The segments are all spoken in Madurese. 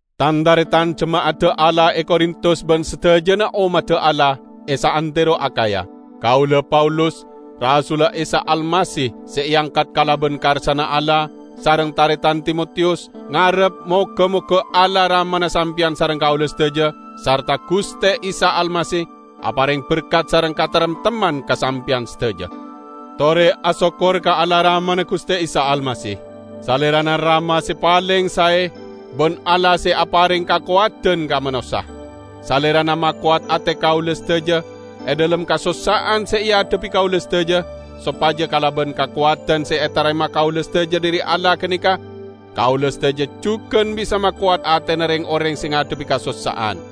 Tan-taretan jema'adda Allah e Korintus ban sadajana ommadda Allah e saantero Akhaya. Kaula, Paulus, rasulla Isa Almasih, se eangkat kalaban karsana Allah, sareng taretan Timotiyus, ngarep moga-moga Allah Ramana sampeyan sareng kaula sadaja sarta Guste Isa Almasih apareng berkat sareng kataremtemman ka sampeyan sadaja. Tore asokkor ka Allah Ramana Guste Isa Almasih. Salerana Rama se paleng sae, ban Allah se apareng kakowadan ka manossa. Salerana makowat ate kaula sadaja e dhalem kasossa'an se eadhebbi kaula sadaja, sopaja kalaban kakowadan se etarema kaula sadaja dhari Allah ganeka kaula sadaja jugan bisa makowat atena reng-oreng se ngadhebbi kasossa'an.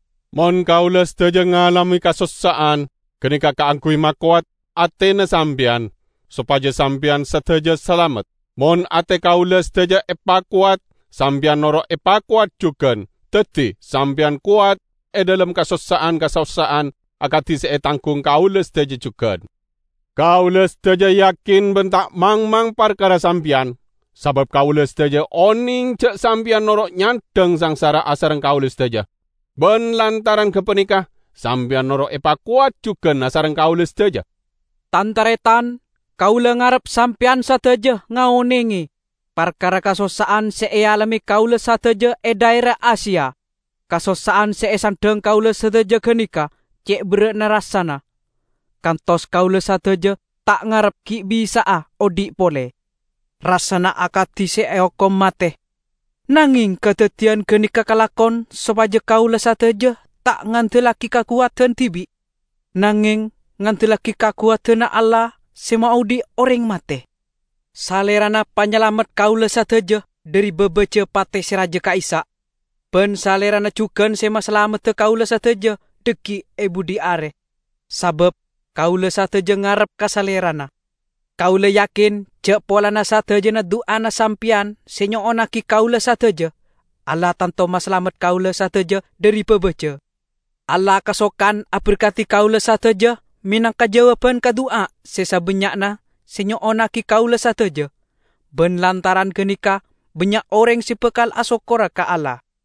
Mon kaula sadaja ngalame kasossa'an, ganeka kaangguy makowat atena sampeyan, sopaja sampeyan sadaja salamet. Mon ate kaula sadaja epakowat, sampeyan noro' epakowat jugan, daddi sampeyan kowat e dhalem kasossa'an-kasossa'an akadi se etanggung kaula sadaja jugan. Kaula sadaja yakin ban ta' mangmang parkara sampeyan, sabab kaula sadaja oneng ja' sampeyan noro' nyandhang sangsara asareng kaula sadaja. Ban lantaran gapaneka sampeyan noro' epakowat jugan asareng kaula sadaja. Tan-taretan! Kaula ngarep sampeyan sadaja ngaonenge parkara kasossa'an se ealame kaula sadaja e dhaera Asia. Kasossa'an se esandhang kaula sadaja ganeka ce' berra'na rassana, kantos kaula sadaja ta' ngarep gi' bisa'a odhi' pole; rassana akadi se eokom mate. Nangeng kadaddiyan ganeka kalakon sopaja kaula sadaja ta' ngandellagi kakowadan dibi', nangeng ngandellagi kakowadanna Allah se maodhi' oreng mate. Salerana panyalamet kaula sadaja dhari babaja pate se raja ka'issa'. Ban Salerana jugan se masalamedda kaula sadaja dhaggi' e budhi are, sabab kaula sadaja ngarep ka Salerana. Kaula yakin ja' polana sadajana du'ana sampeyan se nyo'onnagi kaula sadaja, Allah tanto masalamet kaula sadaja dhari babaja. Allah kasokan aberkadi kaula sadaja menangka jawaban ka du'a se sabannya'na se nyo'onnagi kaula sadaja, ban lantaran ganeka bannya' oreng se bakal asokkora ka Allah.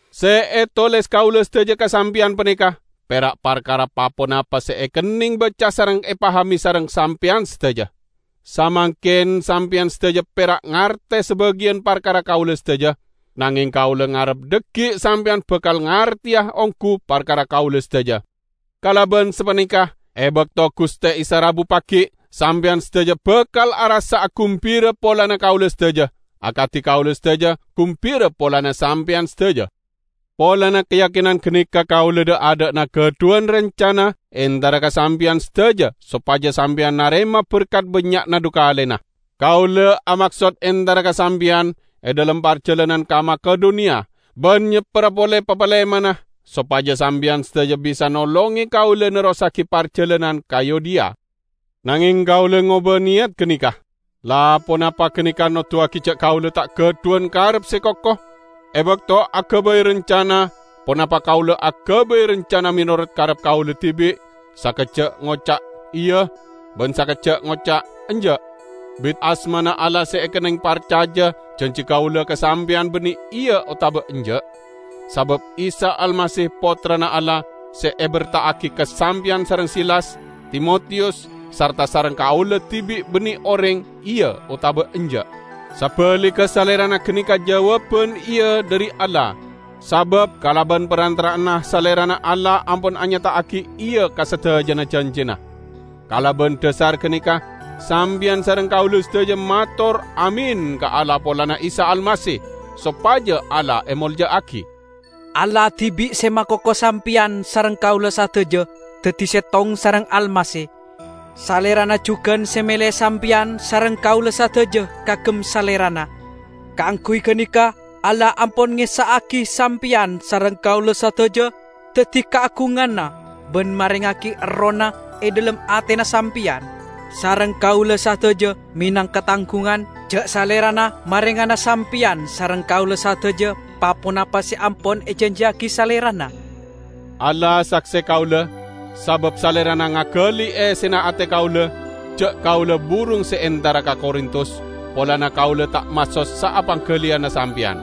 Se etoles kaula sadaja ka sampeyan paneka pera' parkara pa-ponapa se ekenneng baca sareng epahame sareng sampeyan sadaja. Samangken sampeyan sadaja pera' ngarte sabagiyan parkara kaula sadaja, nangeng kaula ngarep dhaggi' sampeyan bakal ngarteya onggu parkara kaula sadaja. Kalaban sapaneka, e bakto Guste Isa rabu pagi', sampeyan sadaja bakal arassa'a gumbira polana kaula sadaja, akadi kaula sadaja gumbira polana sampeyan sadaja. Polana kayakinan ganeka kaula dha'-adha'na gadhuwan rancana entara ka sampeyan sadaja sopaja sampeyan narema berkat bannya'na dhu kalena. Kaula amaksod entara ka sampeyan e dhalem parjalanan ka Makedoniya, ban nyepperra pole papalemanna, sopaja sampeyan sadaja bisa nolonge kaula nerrossagi parjalanan ka Yudea. Nangeng kaula ngoba neyat ganeka. La, ponapa ganeka noduwagi ja' kaula ta' gadhuwan karep se koko? E bakto agabay rancana, ponapa kaula agabay rancana menorot karep kaula dibi', sakejja' ngoca' "Iya", ban sakejja' ngoca' "Enja'"? Bit asmana Allah se ekenneng parcaja, janji kaula ka sampeyan banne "Iya" otaba "Enja'". Sabab Isa Almasih, Pottrana Allah, se eberta'agi ka sampeyan sareng Silas, Timotiyus sarta sareng kaula dibi' banne oreng "Iya" otaba "Enja'" Sabaligga Salerana ganeka jawaban "Iya" dhari Allah. Sabab kalaban parantara'anna Salerana Allah ampon anyata'agi "Iya" ka sadajana janjina. Kalaban dhasar ganeka sampeyan sareng kaula sadaja mator "Amin" ka Allah polana Isa Almasih, sopaja Allah emolja'agi. Allah dibi' se makoko sampeyan sareng kaula sadaja daddi settong sareng Almasih; Salerana jugan se mele sampeyan sareng kaula sadaja kaagem Salerana. Kaangguy ganeka Allah ampon ngessa'agi sampeyan sareng kaula sadaja daddi kaagunganna ban marengngagi Errohna e dhalem atena sampeyan sareng kaula sadaja menangka tanggungan ja' Salerana marengana sampeyan sareng kaula sadaja pa-ponapa se ampon ejanjiyagi Salerana. Allah sakse kaula -- sabab Salerana ngagali essena ate kaula -- ja' kaula burung se entara ka Korintus polana kaula ta' masossa'a panggaliyanna sampeyan.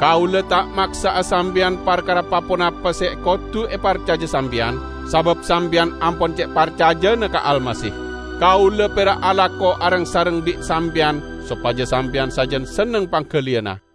Kaula ta' maksa'a sampeyan parkara pa-ponapa se kodu eparcaja sampeyan, sabab sampeyan ampon ce' parcajana ka Almasih. Kaula pera' alako areng-sareng bi' sampeyan sopaja sampeyan sajan senneng panggaliyanna.